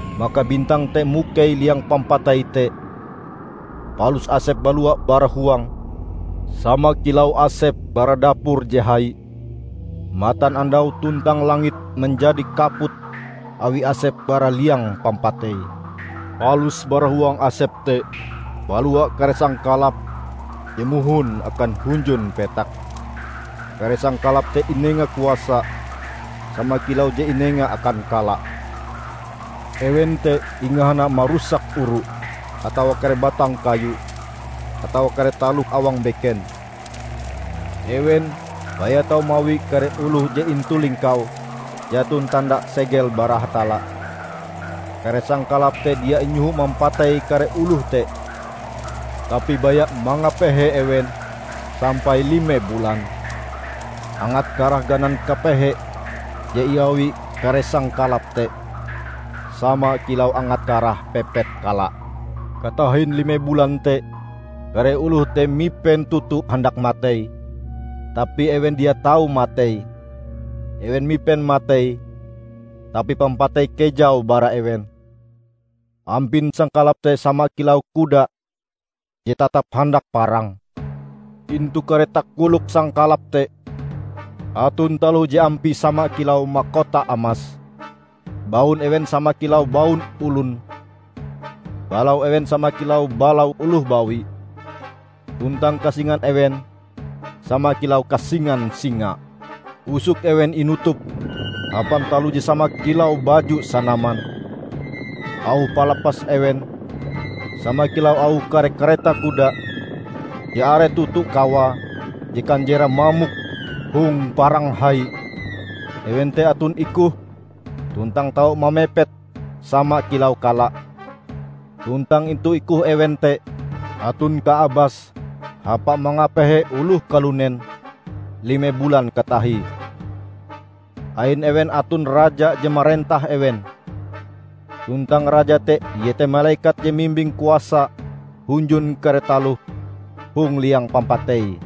Maka bintang te mukei liang pampatei te, palus asep balua bara huange sama kilau asep bara dapur je hai. Matanandau tuntang langit manjadi kaput awi asep bara liang pampatei. Palus bara huang asep te balua kare sangkalap je mohon akan hunjun petak. Kare sangkalap te inenga kuasa sama kilau je inenga akan kala. Ewen te ingahana marusak oru, atawa kare batang kayu, atawa kare taloh awang beken. Ewen baya tau mawi kare oloh je intu lingkaue jaton tanda segel bara Hatalla. Kare sangkalap te dia inyoho mampatei kare oloh te, tapi baya mangapehe ewen sampai lime bulan. Angat karah ganan kapehe je iawi kare sangkalap te sama kilau angat karah pepet kala. Katahin lime bulan te kare oloh te mipen toto handak matei, tapi ewen dia tau matei; ewen mipen matei tapi pampatei kejau bara ewen. Ampin sangkalap te sama kilau kuda je tatap handak parang. Intu kare takolok sangkalap te aton taloh je ampie sama kilau makota amas. Baun ewen sama kilau baun olon. Balau ewen sama kilau balau oloh bawi, tuntang kasingan ewen sama kilau kasingan singa. Usok ewen inutup hapan taloh je sama kilau baju sanaman. Auh palapas ewen sama kilau auh kare kareta kuda je are toto kawae je kanjerae mamok hong parang hai. Ewen te aton ikohe tuntang tau mamepet sama kilau kala. Tuntang intu ikoh ewen te aton kaabas hapae mangapehe oloh kalunen lime bulan katahie. Ain ewen aton raja je marentah ewen, tuntang raja te iete malekat je mimbing kuasa hunjun kare taloh hong liang pampatei.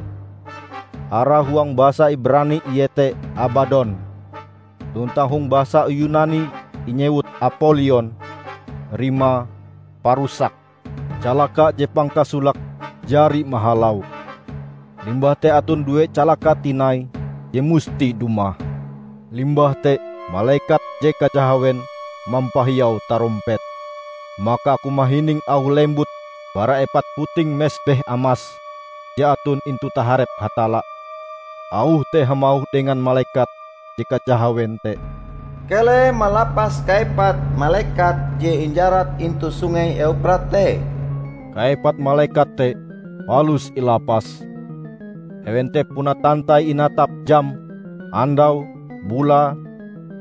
Arae huang bahasa Ibrani iete Abadon; tuntang hong bahasa Yunani inyewut Apolion (rimae "Parusak"). Calaka je pangkasolake jari mahalau. Limbah te aton due calaka tinai je musti dumah. Limbah te malekat je kajahawen mampahiau tarompete. Maka aku mahining auh lembut bara epat puting mesbeh amas je aton intu taharep Hatalla. Auh te hamauh dengan malekat je kajahawen te, "Keleh malapas kaepat malekat je injarat intu Sungei Euprat te!" Kaepat malekat te palus ilapas. Ewen te puna tantai inatap jame, andaue, bulae,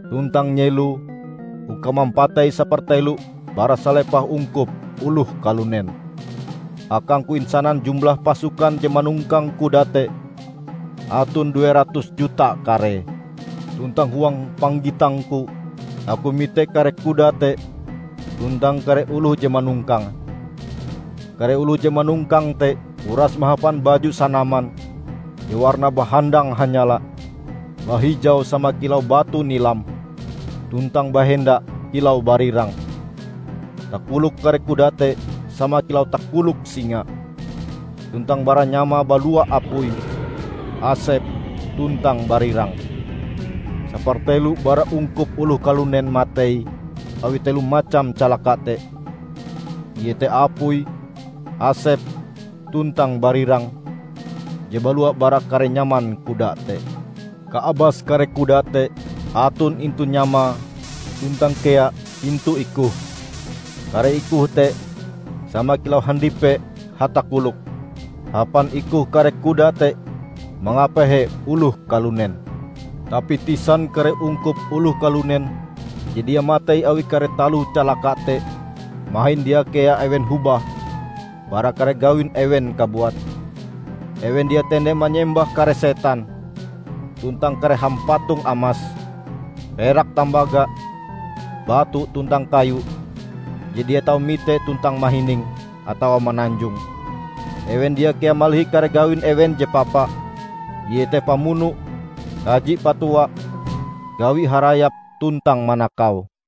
tuntang nyeloe uka mampatei sapertelo bara salepah ungkup oloh kalunen. Akangku insanan jumlah pasukan je manongkang kuda te aton due ratus juta karee. Tuntang huang panggitangku aku mite kare kuda te tuntang kare oloh je manongkange. Kare oloh je manongkange te uras mahapan baju sanaman je warnae bahandang hanyala, bahijau sama kilau batu nilam, tuntang bahenda kilau barirang. Takolok kare kuda te sama kilau takolok singa, tuntang bara nyamae balua apui, asep tuntang barirang. Sapertelo bara ungkup oloh kalunen matei awi telo macam calaka te; iete apui, asep tuntang barirang je balua bara kare nyaman kuda te. Kaabas kare kuda te aton intu nyamae tuntang kea intu ikohe. Kare ikohe te sama kilau handipe hatakolok. Hapan ikohe kare kuda te mangapehe oloh kalunen. Tapi tisan kare ungkup oloh kalunen je dia matei awi kare taloh calaka te, mahin dia kea ewen hobah bara kare gawin ewen kabuat. Ewen dia tende manyembah kare setan, tuntang kare hampatong amas, perak tambaga, batu tuntang kayu je dia tau mite tuntang mahining, atawa mananjong. Ewen dia kea malihi kare gawin ewen je papa, iete pamuno, kaji patua, gawi harayap tuntang manakau.